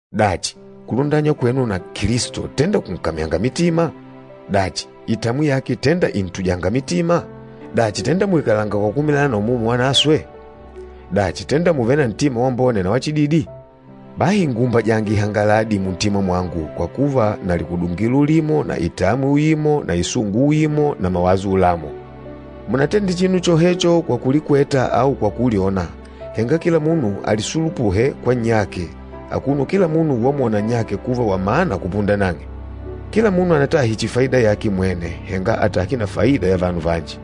Dachi, kulundanywa kwenu na Kilisto tenda kùnkamyanga mitima? Dachi, itamwi yake tenda ìntujanga mitima? Dachi, tenda mùikalanga kwa kukumilana na Umumu Wanaswe? Dachi, tenda mùvele na ntima wambone na wachididi? Bahi nguumbajange ihangaladi muntima mwangu kwa kuva na likudungilo ulimo na itamwi uimo na isungu uimo na mawaso ulamo. Munatende chinu chohecho kwa kulikweta au kwa kulyona, henga kila munu alisulupuhe kwa nnyake, akuno kila munu wamwona nnyake kuva wa mana kupunda nang'e. Kila munu anatahe chihi faida yake mwene, henga atahe na faida ya vanu vanji.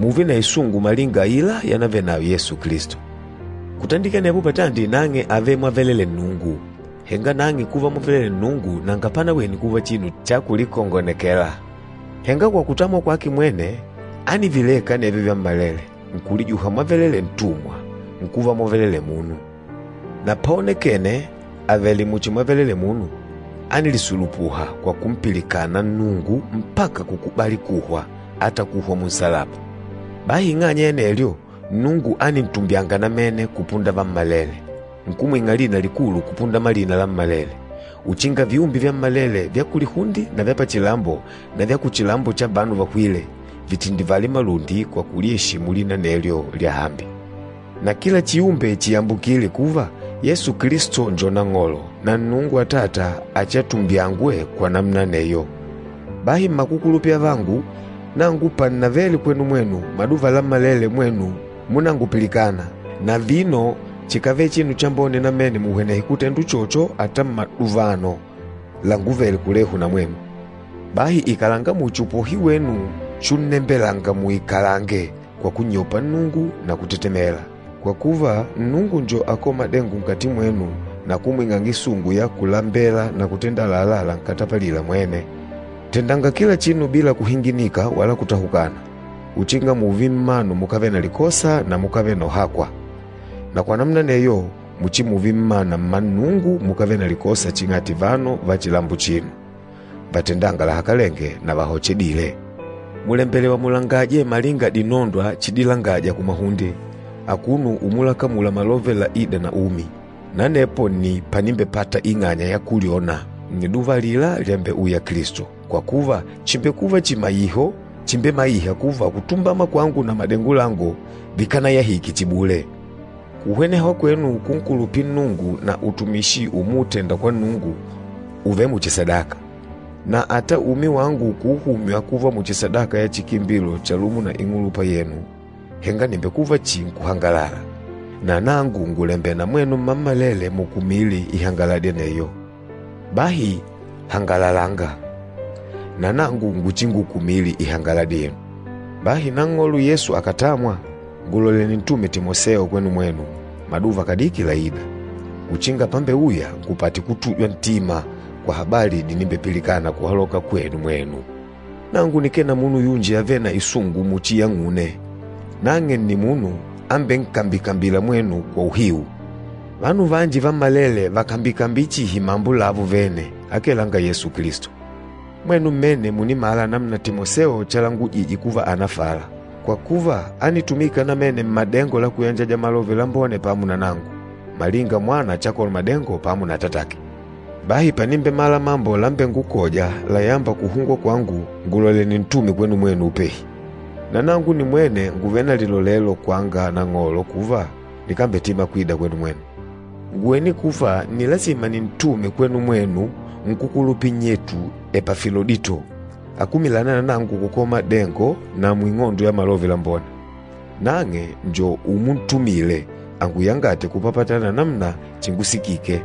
Mùùve na isungu malinga aila yanavenayo Yesu Kilisto. Kutandikila anepo patandi nang'e àvele mwavelelee Nnungu, henga nang'e kuva mwavelelee Nnungu nanga panawene kuva chinu cha kulikongonekela. Henga kwa kutamwa kwake mwene, ánivileka anevyo vyammalele, nkulijuha mwavelelee ntumwa, nkuva mwavelelee munu. Na páonekènè avèlè muchi mwavelelee munu, ánilisulupuha kwa kumpilikana Nnungu mpaka kukubali kuhwa, ata kuhwa munsalaba. Bahi ing'anya ya anelyo, Nnungu ánintumbyanga namene kupunda vammalele, nkumwing'a lina likulu kupunda malina lammalele, uchinga viumbe vyammalele vya kulihunde na vya pachilambo na vya kuchilambo cha vanu vahwîle, vitindivale malundi kwa kulieshimu lina anelyo lyahambi, na kila chiumbe chiyambukile kuva, Yesu Kilisto njo NANG'OLO, na Nnungu Atata achiatumbyangwe kwa namuna aneyo. Bahi mmakukulupila avangu, nangu pannavele kwenu mwenu, maduva lammalele mwenu múnangupilikana, na vino chìkavele chinu chambone namene muhwenehe kutenda uchocho ata mmaduvano languvele kulehu na mwenu. Bahi ikalanga muchi upohi wenu chunnembelanga muikalange kwa kunnyopa Nnungu na kutetemela, kwa kuva, Nnungu njo akôla madengo nkati mwenu na kumwing'anga isungu ya kulambela na kutenda àlalá lankatapalîla mwene. Tendanga kila chinu bila kuhinginika wala kutahukana, uchinga mùùve mmanu mukávele na likosa na mukávele na uhakwa. Na kwa namuna aneyo, muchimuve mmana mma Nnungu mukávele na likosa ching'ati vanu va chilambo achino, vatendânga lahakalenge na vahochedîle. Mùlembelewa mulangaje malinga dinondwa chidilangaja kumahunde, akuno umulakamula malove laîda na umi. Na anepo nni panimbepata ing'anya ya kulyona nniduva alila lyambeuya Kilisto, kwa kuva chìmbekuva chimaiho chimbemaiha kuva kutumbama kwangu na madengo langu vikanayahike chihi bule. Kuhweneha kwenu kunkulupila Nnungu na utumishi umuutenda kwa Nnungu ùvele muchi sadaka. Na ata umi wangu kuuhumywa kuva muchi sadaka ya chikimbilo chalumo na ing'ulupa yenu, henga nìmbekuva chihi nkuhangalala, na nangu ngùlembela na mwenu mmammalele mukumile ihangaladi aneyo. Bahi hangalalanga, na nangu nguchingukumile ihangaladi yenu. Bahi Nang'olo Yesu akàtamwa, ngùlolela nintume Timoseo kwenu mwenu, maduva kadiki laîda, uchinga pambeuya ngupate kutujwa ntima kwa habali dinimbepilikana kuhaloka kwenu mwenu. Nangu nikee na munu yunji avêle na isungu muchi yang'une, nang'e nni munu ambenkambikambîla mwenu kwa uhiu. Vanu vanji vammalele vàkambikambila chihi mambo lavo vene, akee langa Yesu Kilisto. Mwenu mmene mùnimala namuna Timoseo chalilangujije kuva ànafala, kwa kuva ánitumika namene mmadengo la kuyanjaja Malove Lambone pamo na nangu, malinga mwana chakola madengo pamo na atatake. Bahi panimbemala mambo lambengukôja layâmba kuhungwa kwangu, ngùlolela nintume kwenu mwenu upehi. Na nangu nimwene ngùvele na lilolelo kwanga Nang'olo kuva, nikambetima kwida kwenu mwenu. Ngùwene kuva nni lasima nintume kwenu mwenu nkúkulupila nnyetu Epafilodito, akumilâna na nangu kukola madengo na muing'ondo ya Malove Lambone. Nang'e njo umuntumile anguyangate kupapatana na namuna chingusikike.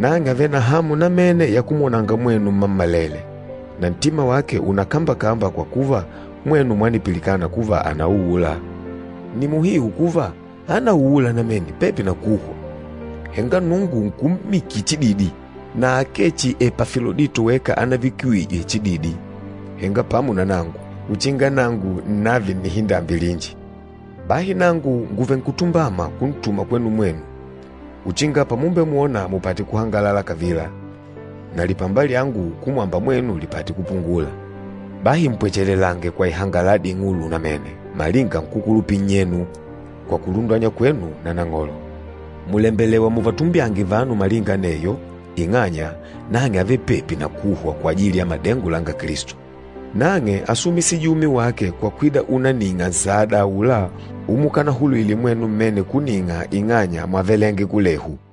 Nang'e àvele na hamu namene ya kumwonanga mwenu mmammalele, na ntima wake ùnakambakamba kwa kuva, mwenu mwanipilikana kuva ànauula. Nni muhiu kuva, ánauula namene pepi na kuhwa, henga Nnungu nkummikila chididi, na akee chihi Epafilodito weka anavikiwijwe chididi, henga pamo na nangu, uchinga nangu nnààve na nnihindambi linji. Bahi nangu nguvenkutumbama kuntuma kwenu mwenu, uchinga pamumbemwona mupate kuhangalala kavila, na lipamba lyangu kumwamba mwenu lipate kupungula. Bahi mpwechelange kwa ihangaladi ing'ulu namene malinga nkúkulupila nnyenu, kwa kulundanywa kwenu na Nang'olo. Mùlembelewa muvatumbyange vanu malinga aneyo, ing'anya, nang'e ávele pepi na kuhwa kwajili ya madengo langa Kilisto. Nang'e ásumisije umi wake kwa kwida unanîng'a nsada aula umukanahulwile mwenu mmene kuning'a ing'anya mwávelenge kulehu.